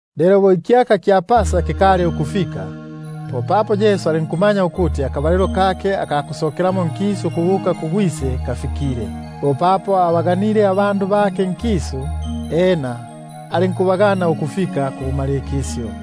Lelo bo ikyaka kya Pasa kikali ukufika, popapo Yesu alinkumanya ukuti akabalilo kake aka kusokelamo nkisu ukubuka kuGwise kisile. Bo papo abaganile abandu bake nkisu, popapo alinkubagana ukufika kubumalikisyo.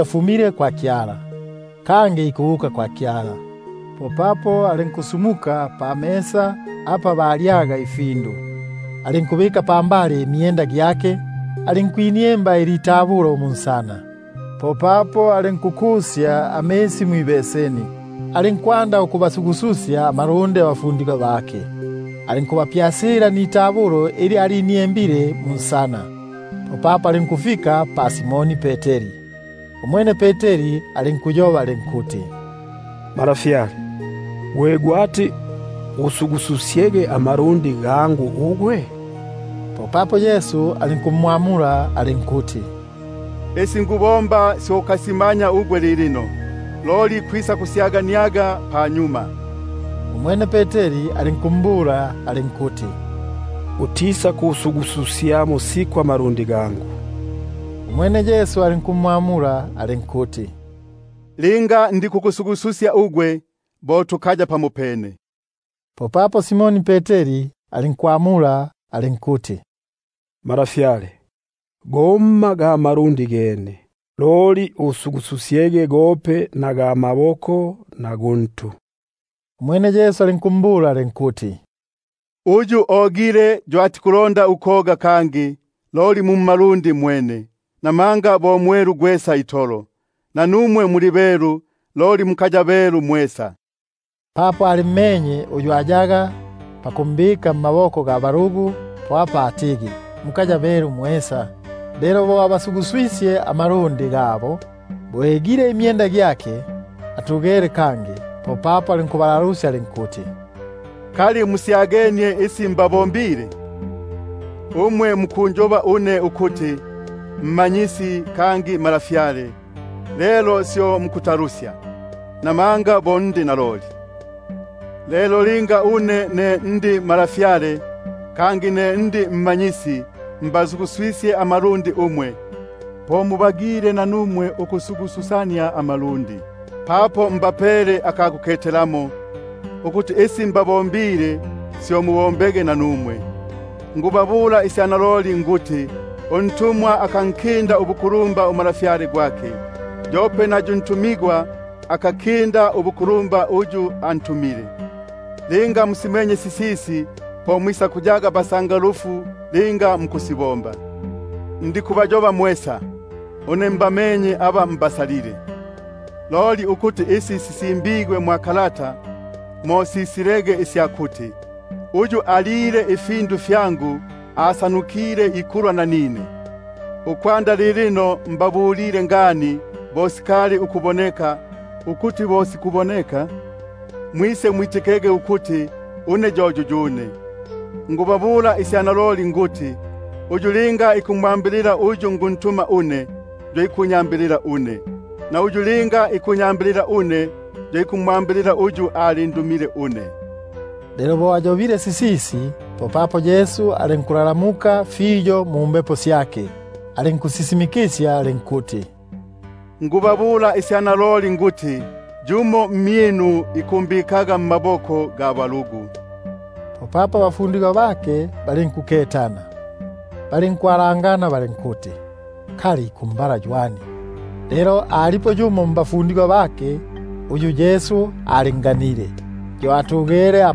afumile kwa Kyala, kangi ikubuka kwa Kyala, alinkusumuka apa balyaga, alinkubika unselekesye gwake pambali, alinkwi- nienga itabulo munsana. Popapo alinkukusya amisi mwibeseni, alinkwanda ukubasugususya mmalundi abafundigwa bake, alinkugapyasila nitabulo ili aliniengile munsana. Popapo alinkufika pa Simoni Peteri. Umwene alinkundalusya alinkuti: Malafyale, gwe gwati usugususyege amalundi gangu ugwe? Popapo Yesu alinkumwamula alinkuti: Isi nikubomba syo ukasimanya ugwe lilino, loli kwisakusyaganiaga panyuma. Umwene Peteri alinkumbula alinkuti: Utisakusugususyamo siku amalundi gangu. Popapo Yesu alinkumwamula alinkuti: Linga ndikukusugususya ugwe, bo tukaya pamopene. Umwene Simoni Peteri alinkumbula alinkuti: Malafyale, gomma ga malundi gene, loli usugususyege gope na ga maboko na guntu. Umwene Yesu alinkumbula alinkuti: Uyu ogile yo atikulonda ukoga kangi, loli mu mmalundi mwene, namanga bo mwelu gwesa itolo; nanumwe muli belu, loli mukaya belu mwesa. Papo alimmenye uyu ayaga pakumbika mmaboko ga balugu, po apa atigi: Mukaya belu mwesa. Lelo bo agasuguswisye amalundi gabo, bo egile imyenda gyake atugele kangi, popapo alinkubalalusya alinkuti: Kali musyagenie isi mbabombile? Umwe mukunjoba iya Mmanyisi niya Malafyale, lelo syo mukutalusya, buno bo ndi naloli. Lelo linga une ne ndi Malafyale kangi ne ndi Mmanyisi nikubasugususya amalundi, po mubagile nanumwe ukusugususania amalundi. Buno mbapele aka kuketelamo, ukuti isi mbabombile, syo mubombege nanumwe. Naloliloli nikubabula une nikuti: Untumwa akankinda ubukulumba umalafyale gwake, yope na yu ntumigwa akankinda ubuku- lumba uyu antumile. Linga musimenye sisisi, po muli basangalufu linga mukusibomba. Ndikubayoba mwesa; une mbamenye aba mbasalile; loli ukuti isi sisimbigwe mo simalikilege isya kuti: Uyu ikulya nanine ikisyesye, yo anyinulile ikitende kyake. Ukwanda lilino nikubabulila ngani bo sikali ukuboneka, ukuti bo sikuboneka, mwisemwitikege ukuti une yo yuyune. Naloliloli nikubabula une nikuti: Uyu linga ikumwambilila uyu nikuntuma une, yo ikunyambilila une; na uyu linga ikunyambilila une, yo ikumwambilila uyu alindumile une. Lelo bo ayobile sisisi, popapo Yesu alinkusenyendeka mumbepo syake, alinkusisimikisya alinkuti: Naloliloli nikubabula une nikuti, yumo mmyinu isakumbikaga mmaboko ga balugu. Popapo abafundigwa bake balinkuketana, balinkwa- langana ukuti kali ikumbala ywani. Lelo alipo yumo mbafundigwa bake uyu Yesu alinganile, yo alyegemele kuki-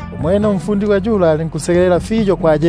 Umwene umfundigwa yula alinkwegamila kukipambaga kya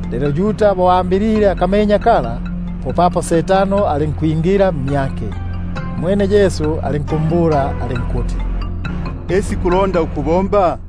Lelo bo ambilile akamenya, popapo Setano alinkwingila mmyake. Umwene Yesu alinkumbula alinkuti: Isi kubomba,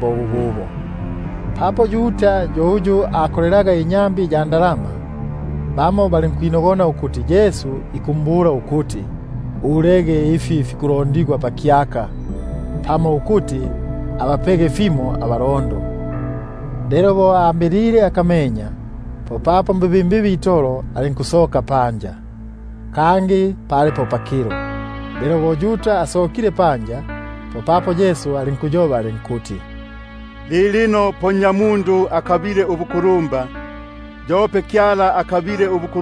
kumyake. Papo Yuda yo uyu akolelaga inyambi ya ndalama, bamo balinkwinogona ukuti Yesu ikumbula ikuti: Ulaga ifi fikulondigwa pakyaka, pamo ukuti abapege fimo abalondo. Lelo bo ambilile akamenya, popapo mbibimbibi itolo alinkusoka panja. Loli pali po pakilo. Lelo bo asokile panja, popapo Yesu alinkuti: Lilino po Nnyamundu akabile ubukulumba, yope Kyala akabile ubuku-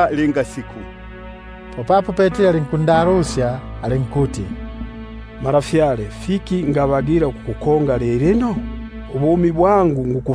panyuma. Popapo Peteri alinkundalusya alinkuti: Malafyale, fiki ngabagila ukukukonga lilino? Ubumi bwangu niku-